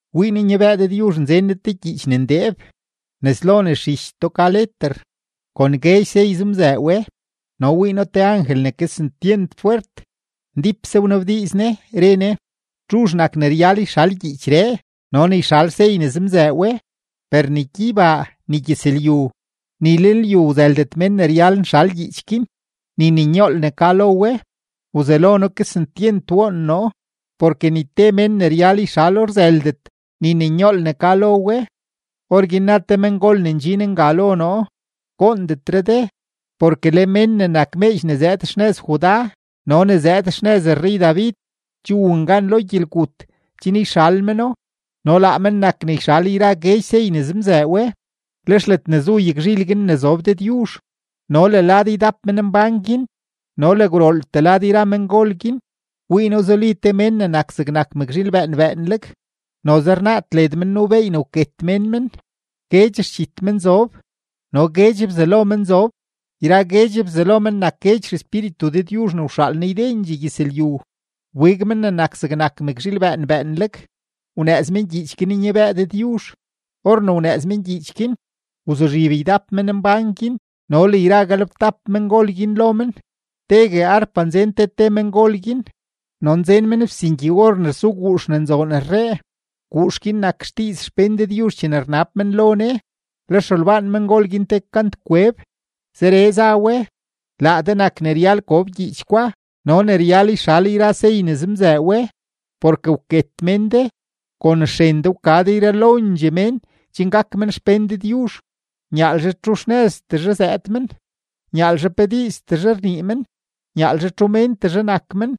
Wii noo nyabëë Dëdyuzh nzen Ne te gyiich ne ndeeb, nes lo nes zhichtoo ka leter, kon guedx sey zemzëë we. No wii noo te angel ne kesentyent fwert, ndípse wnabdiiz ne, re ne: ―¿Txuzh nak ne ryal yxal gyiichree no ne yxal sey ne zemzëë we? Per ni gyeybaa, ni gyëzlyu, ni lenlyu wzëldet mén ne ryal nxal gyiich guin ni ne nyool ne ka lo we. Wzelo noo kesentyent woon noo, porke ni te mén ne ryal yxalo rzëldet ni ne nyool ne ka lo we. Orguin na te mengol ne ndxin nga lo noo: ―Goondetre de, porke le Men ne nak meedx ne zëëd xnëz Judá no ne zëëd xnëz rrey-David che wun gan lo gyelgut chen yxal meno no laa men nak ne yxal yra guedx sey ne zemzëë we. Lex ledne zu yagzhil guin ne zob Dëdyuzh no le lad ydap menmbán guin no le gwrooltee yra mengol guin, wii noo zuli te Mén ne nak zegnak mëkzhiil bëën bëënleg, noze rnaad led men nuu beey ne wket mén men. Guedx xdxit men zob no guedx bzalo men zob; yra guedx bzalo men nak guedx xespíritu Dëdyuzh ne wxaal Ne ydendxee gyëzlyu. Wbig Men ne nak zegnak mëkzhiil bëën bëënleg, wnëëz men gyiich guin nyabëë Dëdyuzh. Or ne wnëëz men gyiich guin, wzuzhib ydap menmbán guin no le yra galebtap mengol guin lo men. Tegue arpa nzen te te mengol guin no nzen men fsingyi-or ne rsu guux ne nzoon rree; guux guin nak xdiiz xpén Dëdyuzh chene rnab men lo Ne. Lex rolbaan mengol guin te kantkweb, zeree za we: Laa de nak ne ryal gob gyiich gwa no ne ryal yxal yra sey ne zemzëë we; porke wket mén de, kon xren de wka de yralondxee mén chen gak men xpén Dëdyuzh, nyaalzhe txu xnëztezhe zëëd men, nyaalzhe pe diiztezhe rnii men, nyaalzhe txu méntezhe nak men,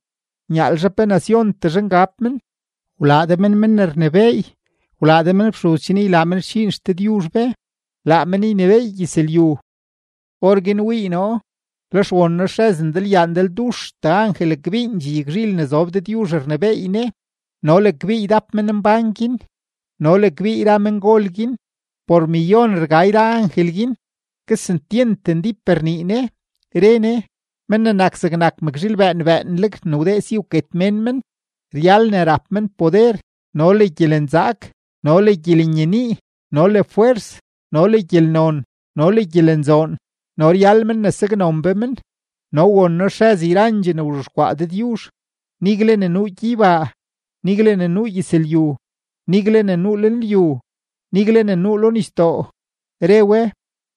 nyaalzhe pe naciontezhe ngab men. Wlaa de men men ne rnebééy, wlaa de men fxuz chen ylaa men xdxiin XDëdyuzh be, laa men ynebééy gyëzlyu. Orguin wii noo, lex won noo xrëz ndalyaa ndalduxtee angel kbiindxee yagzhil ne zob Dëdyuzh rnebééy Ne no le kbii ydap menmbán guin no le kbii yra mengol guin; por millón rga yra angel guin; kesentyent ndíp rnii ne, re ne: Men ne nak zegnak mëkzhiil bëën bëënleg ne wdee si ne wket mén men, ryal ne rap men poder no le gyelenzaak no le gyelenyenii no le fwers, no le gyelnon no le gyelenzoon, no ryal men ne saknon be men. No won noo xrëz yrandxee ne wzhexkwaa Dëdyuzh, nigle ne nuu gyeybaa, nigle ne nuu gyëzlyu, nigle ne nuu lenlyu, nigle ne nuu lo nisdoo, re we: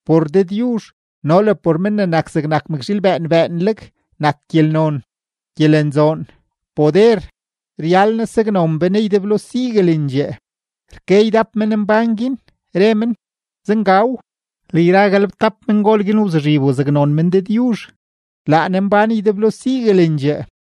¡Por Dëdyuzh no le por Men ne nak zegnak mëkzhiil bëën bëënleg nak gyelnon, gyelenzoon, poder, ryal Ne saknon be Ne ydeblo siguelendxee! Rke ydap menmbán guin, re men: ―¡Zengaw! Le yra galebtap mengol guin wzuzhib wzaknon men Dëdyuzh; laa Ne mbán ydeblo siguelendxee.